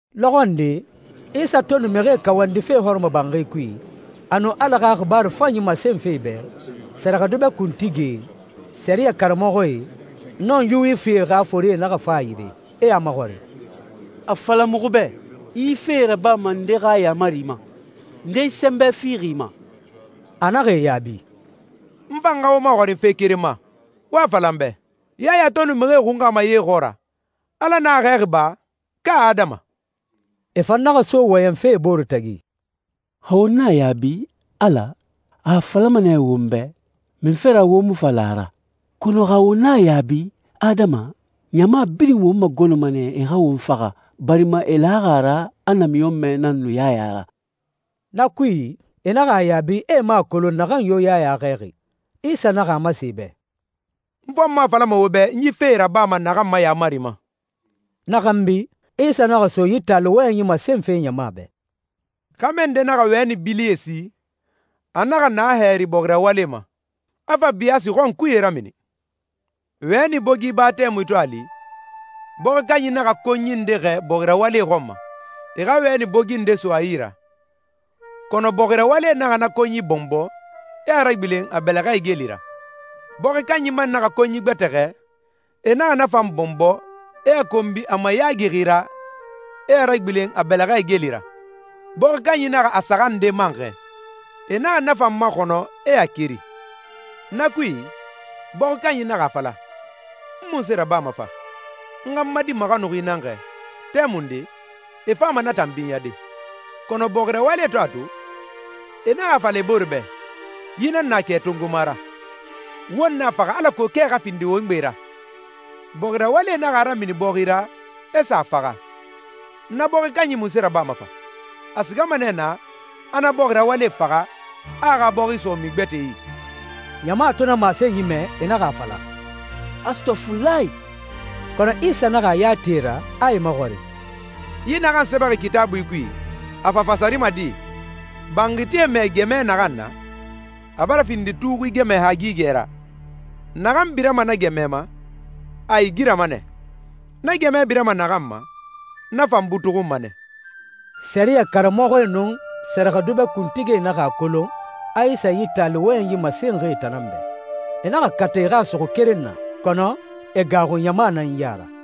Lɔxɔ nde, Isa to nu mixie kawandife hɔrɔmɔbanxi kui, a nu Ala xa xibaaru fanyi masenfe e bɛ, sɛrɛxɛdubɛ kuntigie, sɛriyɛ karamɔxɔe, nun Yuwifie xa forie naxa fa a yire, e a maxɔrin, «A fala muxu bɛ, i yi fee rabama nde xa yaamari ma? Nde yi sɛnbɛ fixi i ma?» A naxa e yaabi, «N fan xa wo maxɔrin fe keren ma. Wo a fala n bɛ, Yaya to nu mixie xunxama ye xɔɔra, Ala nan a xɛɛxi ba, ka adama?» E fan naxa so wɔyɛnfe e bore tagi, «Xa won na a yaabi, ‹Ala,› a a falama nɛ won bɛ, ‹Munfe ra wo mu fa la a ra?› Kɔnɔ xa won na a yaabi, ‹Adama,› ɲama birin won magɔnɔma nɛ e xa won faxa, barima e laxi a ra a namiɲɔnmɛ nan nu Yaya ra.» Na kui, e naxa a yaabi a e mu a kolon naxan yo Yaya xɛɛxi. Isa naxa a masen e bɛ, «N fan mu a falama wo bɛ n yi fee rabama naxan ma yaamari ma.» Na xanbi, Isa naxa so yi taali wɔyɛnyi masenfe ɲama bɛ. «Xɛmɛ nde naxa wɛni bilie si. A naxa na hɛri bɔxi rawalie ma, a fa biyaasi xɔnkuye ramini. Wɛni bogi ba tɛmui to a li, bɔxi kanyi naxa konyi nde xɛɛ bɔxi rawalie xɔn ma, e xa wɛni bogi nde so a yi ra. Kɔnɔ bɔxi rawalie naxa na konyi bɔnbɔ, e a ragbilen a bɛlɛxɛ igeli ra. Bɔxi kanyi man naxa konyi gbɛtɛ xɛɛ. E naxa na fan bɔnbɔ, e a konbi a mayaagixi ra, e a ragbilen a bɛlɛxɛ igeli ra. Bɔxi kanyi naxa a saxan nde man xɛɛ. E naxa na fan maxɔnɔ, e a keri.» «Na kui, bɔxi kanyi naxa a fala, ‹N munse rabama fa? N xa n ma di maxanuxi nan xɛɛ. Tɛmunde, e fama na tan binyade.› Kɔnɔ bɔxi rawalie to a to, e naxa a fala e bore bɛ, ‹Yi nan na kɛ tongoma ra. Won na a faxa alako kɛ xa findi won gbe ra.› Bɔxi rawalie naxa a ramini bɔxi ra, e sa a faxa.» «Na bɔxi kanyi munse rabama fa? A sigama nɛ naa, a na bɔxi rawalie faxa, a a xa bɔxi so mixi gbɛtɛe yi.» Ɲama to na masenyi mɛ, e naxa a fala, «Astɔfulahi!» Kɔnɔ Isa naxa a ya ti e ra, a e maxɔrin, «Yi naxan sɛbɛxi Kitaabui kui, a fa fasarima di? ‹Banxitie mɛɛ gɛmɛ naxan na, a bara findi tuxui gɛmɛ hagigɛ ra.›» «Naxan birama na gɛmɛ ma, a igirama nɛ. Na gɛmɛ birama naxan ma, na fan butuxunma nɛ.» Sɛriyɛ karamɔxɔe nun sɛrɛxɛdubɛ kuntigie naxa a kolon a Isa yi taali wɔyɛnyi masenxi e tan nan bɛ. E naxa kata e xa a suxu keren na, kɔnɔ e gaaxu ɲama nan ya ra.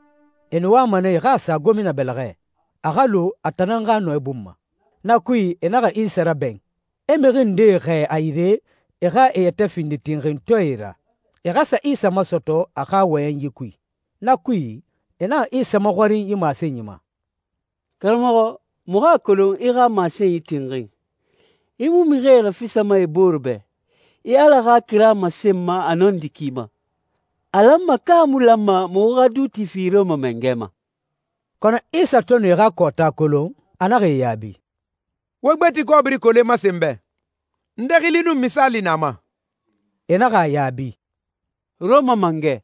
E nu wama nɛ e xa a sa gomina bɛlɛxɛ, a xa lu a tan nan xa nɔɛ bun ma. Na kui, e naxa Isa rabɛn, e mixi ndee xɛɛ a yire e xa e yɛtɛ findi tinxintɔɛe ra, e xa sa Isa masɔtɔ a xa wɔyɛnyi kui. Na kui, e naxa Isa maxɔrin yi masenyi ma, «Karamɔxɔ, muxu a kolon i xa masenyi tinxin. I mu mixi e rafisama e bore bɛ, i Ala xa kira masenma a nɔndi ki ma. A lanma ka a mu lanma muxu xa duuti fi Rɔma mangɛ ma?» Kɔnɔ Isa to nu e xa kɔɔta kolon, a naxa e yaabi, «Wo gbeti kɔbiri kole masen n bɛ. Nde xili nun misaali na a ma?» E naxa a yaabi, «Rɔma Mangɛ.»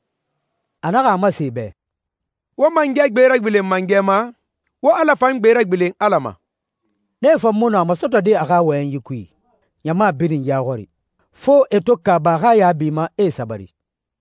A naxa a masen e bɛ, «Wo mangɛ gbe ragbilen mangɛ ma, wo Ala fan gbe ragbilen Ala ma.» Nee fan mu nɔ a masɔtɔde a xa wɔyɛnyi kui, ɲama birin ya xɔri. Fo e to kaaba a xa yaabi ma, e sabari.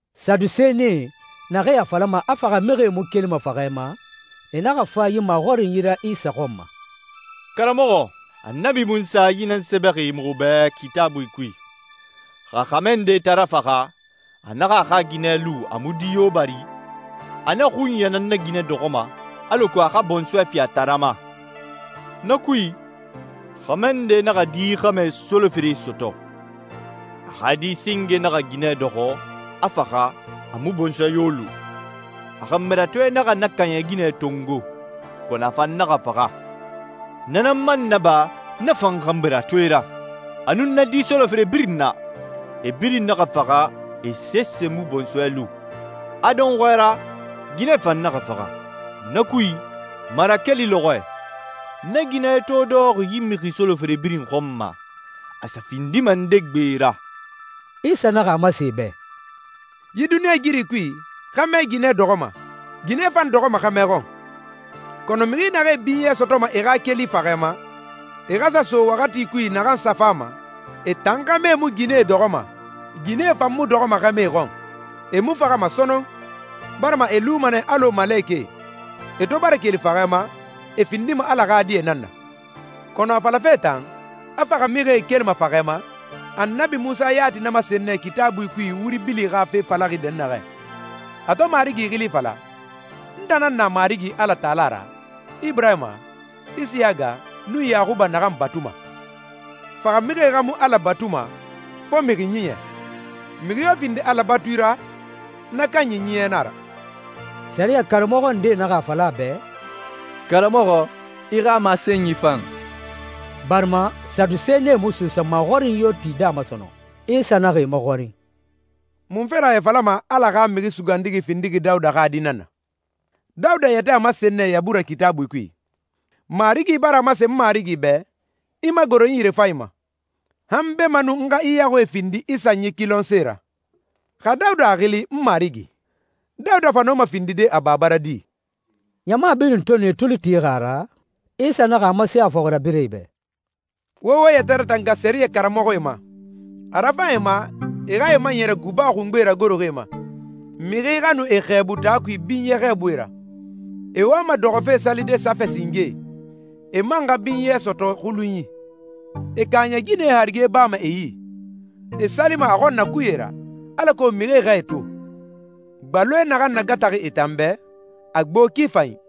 Sadusenie, naxee a falama a faxamixie mu kelima faxɛ ma, e naxa fa yi maxɔrinyi ra Isa xɔn ma, «Karamɔxɔ, Annabi Munsa yi nan sɛbɛxi muxu bɛ Kitaabui kui, ‹Xa xɛmɛ nde taara faxa, a naxa a xa ginɛ lu a mu di yo bari, a na xunya nan na ginɛ dɔxɔma, alako a xa bɔnsɔɛ fi a taara ma.› Na kui, xɛmɛ nde naxa di xɛmɛ solofere sɔtɔ. A xa di singe naxa ginɛ dɔxɔ, a faxa, a mu bɔnsɔɛ yo lu. A xanbiratoe naxa na kaaɲɛ ginɛ tongo, kɔnɔ a fan naxa faxa. Na nan man naba na fan xanbiratoe ra, a nun na di solofere birin na. E birin naxa faxa, e sese mu bɔnsɔɛ lu. A dɔnxɔɛ ra, ginɛ fan naxa faxa. Na kui, marakeli lɔxɔɛ, na ginɛ to dɔxɔxi yi mixi solofere birin xɔn ma, a sa findima nde gbe ra?» Isa naxa a masen e bɛ, «Yi duniɲɛigiri kui, xɛmɛ ginɛ dɔxɔma, ginɛ fan dɔxɔma xɛmɛ xɔn. Kɔnɔ mixi naxee binyɛ sɔtɔma e xa keli faxɛ ma, e xa sa so waxati kui naxan sa fama, e tan xɛmɛe mu ginɛe dɔxɔma, ginɛe fan mu dɔxɔma xɛmɛe xɔn. E mu faxama sɔnɔn, barima e luma nɛ alɔ malekɛe. E to bara keli faxɛ ma, e findima Ala xa die nan na.» «Kɔnɔ a falafe tan, a faxamixie kelima faxɛ ma, Annabi Munsa yati na masen nɛ Kitaabui kui wuri bili xa fe falaxi dɛnnaxɛ, a to Marigi xili fala, ‹N tan nan na Marigi Alatala ra, Iburahima, Isiyaga, nun Yaxuba naxan batuma.› Faxamixie xa mu Ala batuma, fo a mixi ɲiɲɛ. Mixi yo findi Ala batui ra, na kanyi ɲiɲɛ nan a ra.» Sɛriyɛ karamɔxɔ ndee naxa a fala a bɛ, «Karamɔxɔ, i xa masenyi fan,» barima Sadusenie mu suusa maxɔrinyi yo tide a ma sɔnɔn. Isa naxa e maxɔrin, «Munfe ra e a falama a Ala xa Mixi Sugandixi findixi Dawuda xa di nan na? Dawuda yɛtɛ a masen nɛ Yabura Kitaabui kui, ‹Marigi bara a masen n Marigi bɛ, “I magoro n yirefanyi ma, han beemanun n xa i yaxuie findi i sanyi kilɔnse ra.”›» «Xa Dawuda a xili ‹N Marigi›, Dawuda fa nɔma findide a baba ra di?» Ɲama birin to nu e tuli tixi a ra, Isa naxa a masen a fɔxirabirɛe bɛ, «Wo wo yɛtɛ ratanga sɛriyɛ karamɔxɔe ma. A rafan e ma e xa e maɲɛrɛ guba xungbe ragoroxi e ma, mixi xa nu e xɛɛbu taa kui binyɛ xɛɛbui ra. E wama dɔxɔfe salide safɛ singee, e man xa binyɛ sɔtɔ xulunyi. E kaaɲɛ ginɛe harige bama e yi. E salima a xɔnnakuye ra, alako mixie xa e to. Gbaloe naxan nagataxi e tan bɛ, a gbo ki fanyi.»